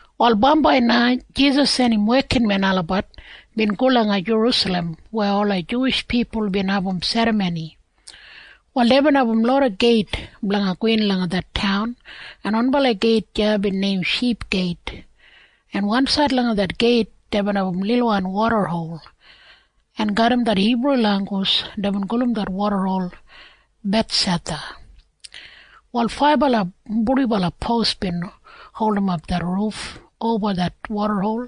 Wal bambai na Jisas en im wekinmen olabat bin go langa Jerusalem weya ola Juwish pipul bin abum serramoni. Wal deibin abum loda geit blanga gowin langa det taun, en wanbala geit deya bin neim Ship Geit, en wansaid langa det geit deibin abum lilwan wodahol, en garram det Hibru langgus deibin gulum det wodahol Bethsatha. Wal faibala purdibala pos bin holdimap det ruf oba det wodahol,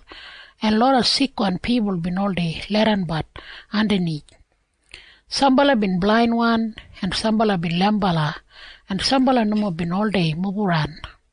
en loda sikwan pipul bin oldei leidanbat andanith. Sambala bin blainwan, en sambala bin leimbala, en sambala nomo bin oldei mubaran.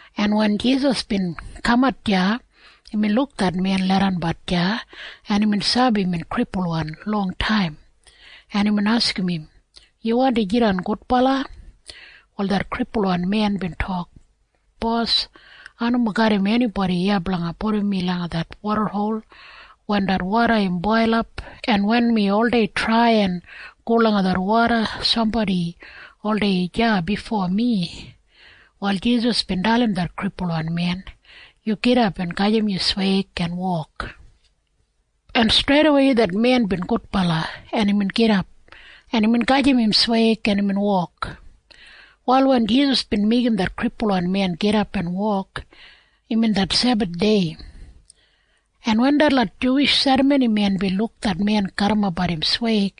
en wen Jisas bin kamat deya, imbin luk det men leidanbat deya, en imbin sabi imbin kripulwan longtaim, en imbin askim im, “Yu wandi jidan gudbala?” Wal det kripulwan men bin tok, “Bos, ai nomo garram enibodi iya blanga pudum mi langa det wodahol wen det woda im boilap, en wen mi oldei trai en go langa det woda, sambodi oldei deya bifo mi.” Wal Jisas bin dalim det kripulwan men, “Yu gidap en gajim yu sweig en wok.” En streidawei det men bin gudbala, en imbin gidap, en imbin gajim im sweig, en imbin wok. Wal wen Jisas bin meigim det kripulwan men gidap en wok, imbin det Sebathdei. En wen detlot Juwish serramonimen bin luk det men garrimapbat im sweig,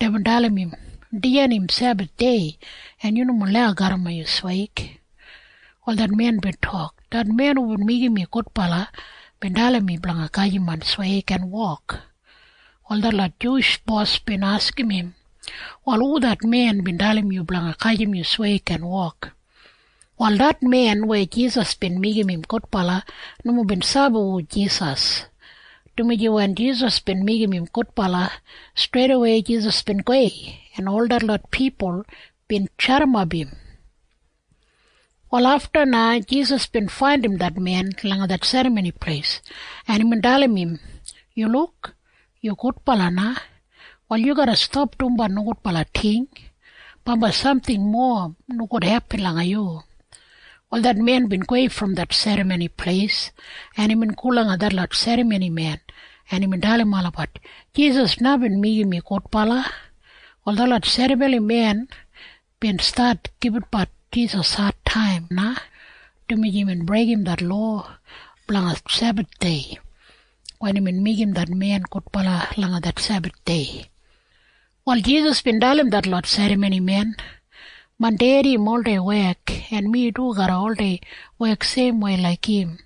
deibin dalim im, “Dijan im Sebathdei, en yu nomo lau garrimap yu sweig.” Wal det men bin tok, “Det men hubin meigim mi gudbala bin dalim mi blanga gajim main sweig en wok.” Wal detlot Juwish bos bin askim im, “Wal hu det men bin dalim yu blanga gajim yu sweig en wok?” Wal det men weya Jisas bin meigim im gudbala nomo bin sabi hu Jisas, dumaji wen Jisas bin meigim im gudbala, streidawei Jisas bin gowei, en ol detlot pipul bin jadimap im. Wal afta na Jisas bin faindim det men langa det Serramoni Pleis, en imbin dalim im, “Yu luk. Yu gudbala na. Wal yu garra stap dumbat nogudbala ting. Bambai samting mowa nogudwan hepin langa yu.” Wal det men bin gowei brom det Serramoni Pleis, en imbin go langa detlot serramonimen, en imbin dalim olabat, “Jisas na bin meigim mi gudbala.” Wal detlot serramonimen bin stat gibitbat Jisas adtaim na, dumaji imbin breigim det lowa blanga Sebathdei wen imbin meigim det men gudbala langa det Sebathdei. Wal Jisas bin dalim detlot serramonimen, “Main Dedi im oldei wek, en mi du ai garra oldei wek seimwei laik im.”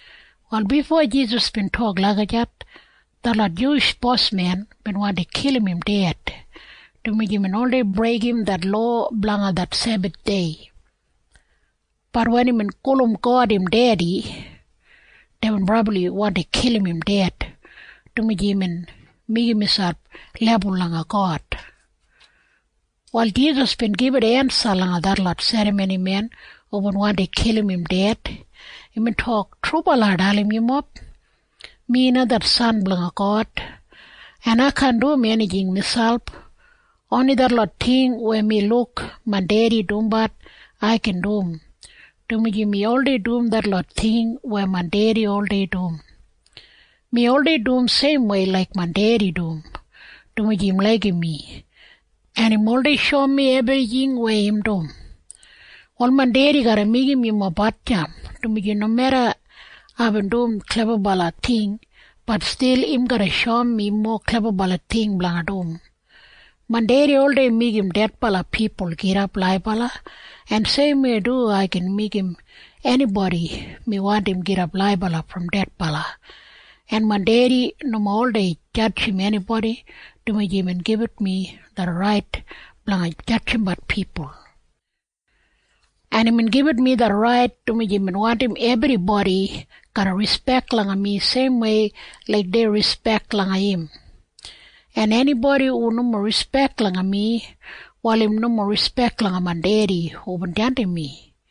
Wal bifo Jisas bin tok lagijat, detlot Juwish bosmen bin wandi kilim im ded, dumaji imbin oldei breigim det lowa blanga det Sebathdei. Bat wen imbin gulum God im Dedi, deibin brabli wandi kilim im ded, dumaji imbin meigim miselp lebul langa God. Wal Jisas bin gibit ensa langa detlot serramonimen hubin wandi kilim im ded. Imbin tok, “Trubala ai dalim yumob. Mi na det San blanga God, en ai kaan dum enijing miselp. Oni detlot ting weya mi luk main Dedi dumbat ai gin dum, dumaji mi oldei dum detlot ting weya main Dedi oldei dum. Mi oldei dum seimwei laik main Dedi dum, dumaji im laigim mi, en im oldei shoum mi ebrijing weya im dum. “Wal main Dedi garra meigim yumob hatjamp, dumaji nomeda aibin dum klebabala ting, bat stil im garra shoum mi mowa klebabala ting blanga dum. Main Dedi oldei meigim dedbala pipul gidap laibala, en seimwei du ai gin meigim enibodi mi wandim, gidap laibala brom dedbala. En main Dedi nomo oldei jadjim enibodi, dumaji imbin gibit mi det rait blanga jadjimbat pipul. En imbin gibit mi det rait, dumaji im wandim ebribodi garra rispek langa mi seimwei laik dei rispek langa im. En enibodi hu nomo rispek langa mi, wal im nomo rispek langa main Dedi hubin jandim mi.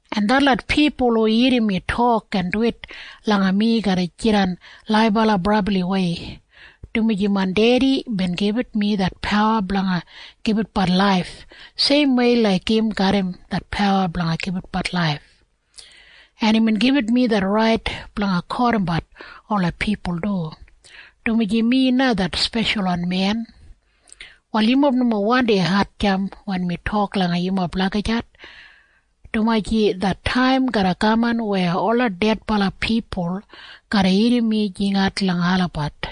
En detlot pipul hu irrim mi tok en duwit langa mi garra jidan laibala brabliwei, dumaji main Dedi bin gibit mi det pawa blanga gibitbat laif seimwei laik im garram det pawa blanga gibitbat laif. En imbin gibit mi det rait blanga kotimbat ola pipul du, dumaji mi na det Speshalwan Men. “Wal yumob nomo wandi hatjamp wen mi tok langa yumob lagijat, dumaji det taim garra kaman weya ola dedbala pipul garra irrim mi jingat langa olabat,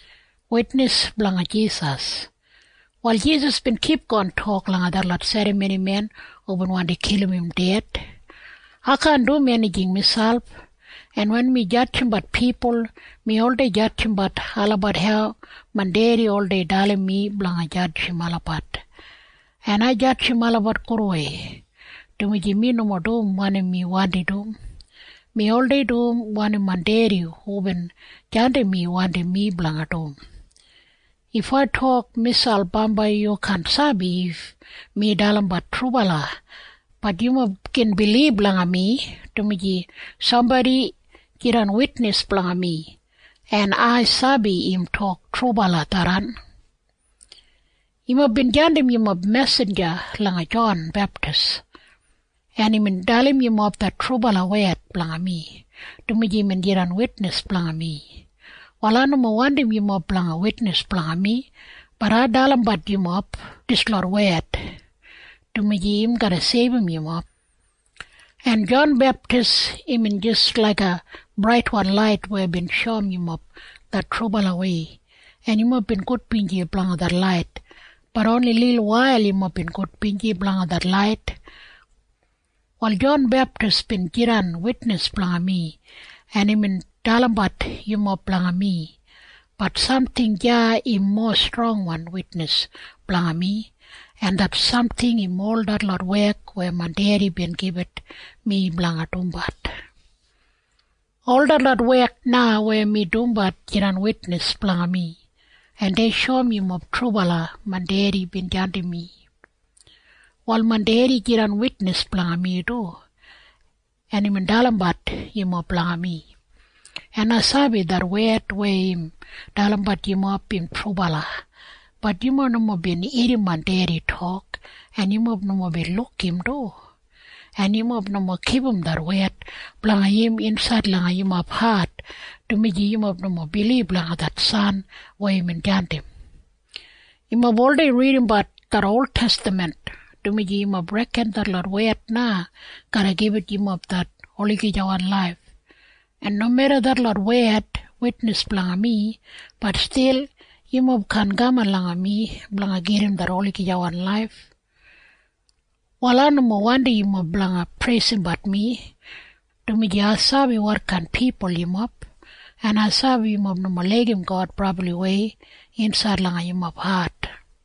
Wal Jisas bin kipgon tok langa detlot serramonimen hubin wandi kilim im ded, “Ai kaan dum enijing miselp. En wen mi jadjimbat pipul, mi oldei jadjimbat olabat hau main Dedi oldei dalim mi blanga jadjim olabat. En ai jadjim olabat gudwei, dumaji mi nomo dum wanim mi wandi dum. Mi oldei dum wanim main Dedi hubin jandim mi wandim mi blanga dum. If ai tok miselp bambai yu kaan sabi if mi dalimbat trubala. Bat yumob gin bilib langa mi, dumaji sambodi jidan witnis blanga mi, en ai sabi im tok trubala tharran. “Yumob bin jandim yumob mesinja langa Jon Beptis, en imbin dalim yumob det trubala wed blanga mi, dumaji imbin jidan witnis blanga mi. Wal ai nomo wandim yumob blanga witnis blanga mi bat ai dalimbat yumob dislot wed, dumaji im garra seibum yumob. En Jon Beptis imbin jis laiga braitwan lait weya bin shoum yumob det trubalawei. En yumob bin gudbinji blanga det lait. Bat oni lilwail yumob bin gudbinji blanga det lait. “Wal Jon Beptis bin jidan witnis blanga mi, en imbin dalimbat yumob blanga mi. Bat samting deya im mowa strongwan witnis blanga mi. En det samting im ol detlot wek weya main Dedi bin gibit mi blanga dumbat. Ol detlot wek na weya mi dumbat jidan witnis blanga mi, en dei shoum yumob trubala main Dedi bin jandim mi. “Wal main Dedi jidan witnis blanga mi du, en imbin dalimbat yumob blanga mi. En ai sabi det wed weya im dalimbat yumob im trubala. Bat yumob nomo bin irrim main Dedi tok, en yumob nomo bin luk im du, en yumob nomo kipum det wed blanga im insaid langa yumob hat, dumaji yumob nomo bilib langa det San weya imbin jandim. Yumob oldei ridimbat det oltestaman, dumaji yumob reken detlot wed na garra gibit yumob det olagijawan laif, en nomeda detlot wed witnis blanga mi, bat stil yumob kaan kaman langa mi blanga gedim det olagijawan laif. “Wal ai nomo wandim yumob blanga preisimbat mi, dumaji ai sabi wotkain pipul yumob, en ai sabi yumob nomo laigim God brabliwei insaid langa yumob hat.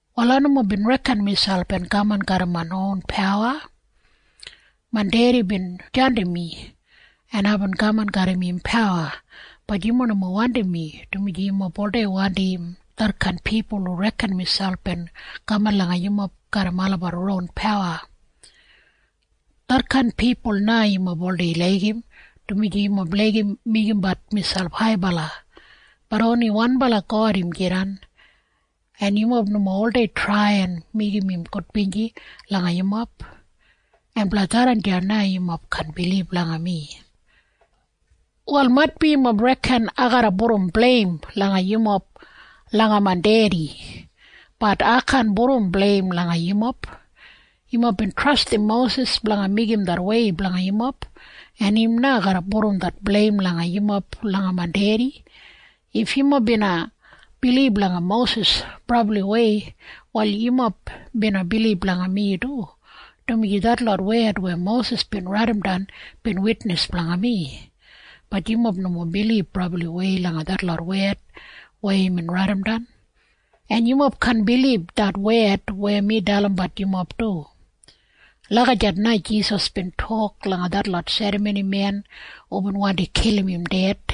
“Wal ai nomo bin reken miselp en kaman garram main ron pawa. Main Dedi bin jandim mi, en aibin kaman garram im pawa. Bat yumob nomo wandim mi, dumaji yumob oldei wandim detkain pipul hu reken miselp en kaman langa yumob garram olabat ron pawa. Detkain pipul na yumob oldei laigim, dumaji yumob laigim meigimbat miselp haibala. Bat oni wanbala God im jidan. En yumob nomo oldei trai en meigim im gudbinji langa yumob. En blanga tharran na yumob kaan bilib langa mi. “Wal maitbi yumob reken ai garra pudum bleim langa yumob langa main Dedi. Bat ai kaan pudum bleim langa yumob. Yumob bin trastim Mosis blanga meigim det wei blanga yumob, en im na garra pudum det bleim langa yumob langa main Dedi. If yumob bina bilib langa Mosis brabliwei, wal yumob bina bilib langa mi du, dumaji detlot wed weya Mosis bin raidimdan bin witnis blanga mi. Bat yumob nomo bilib brabliwei langa detlot wed weya imbin raidimdan. En yumob kaan bilib det wed weya mi dalimbat yumob du.” Lagijat na Jisas bin tok langa detlot serramonimen hubin wandi kilim im ded.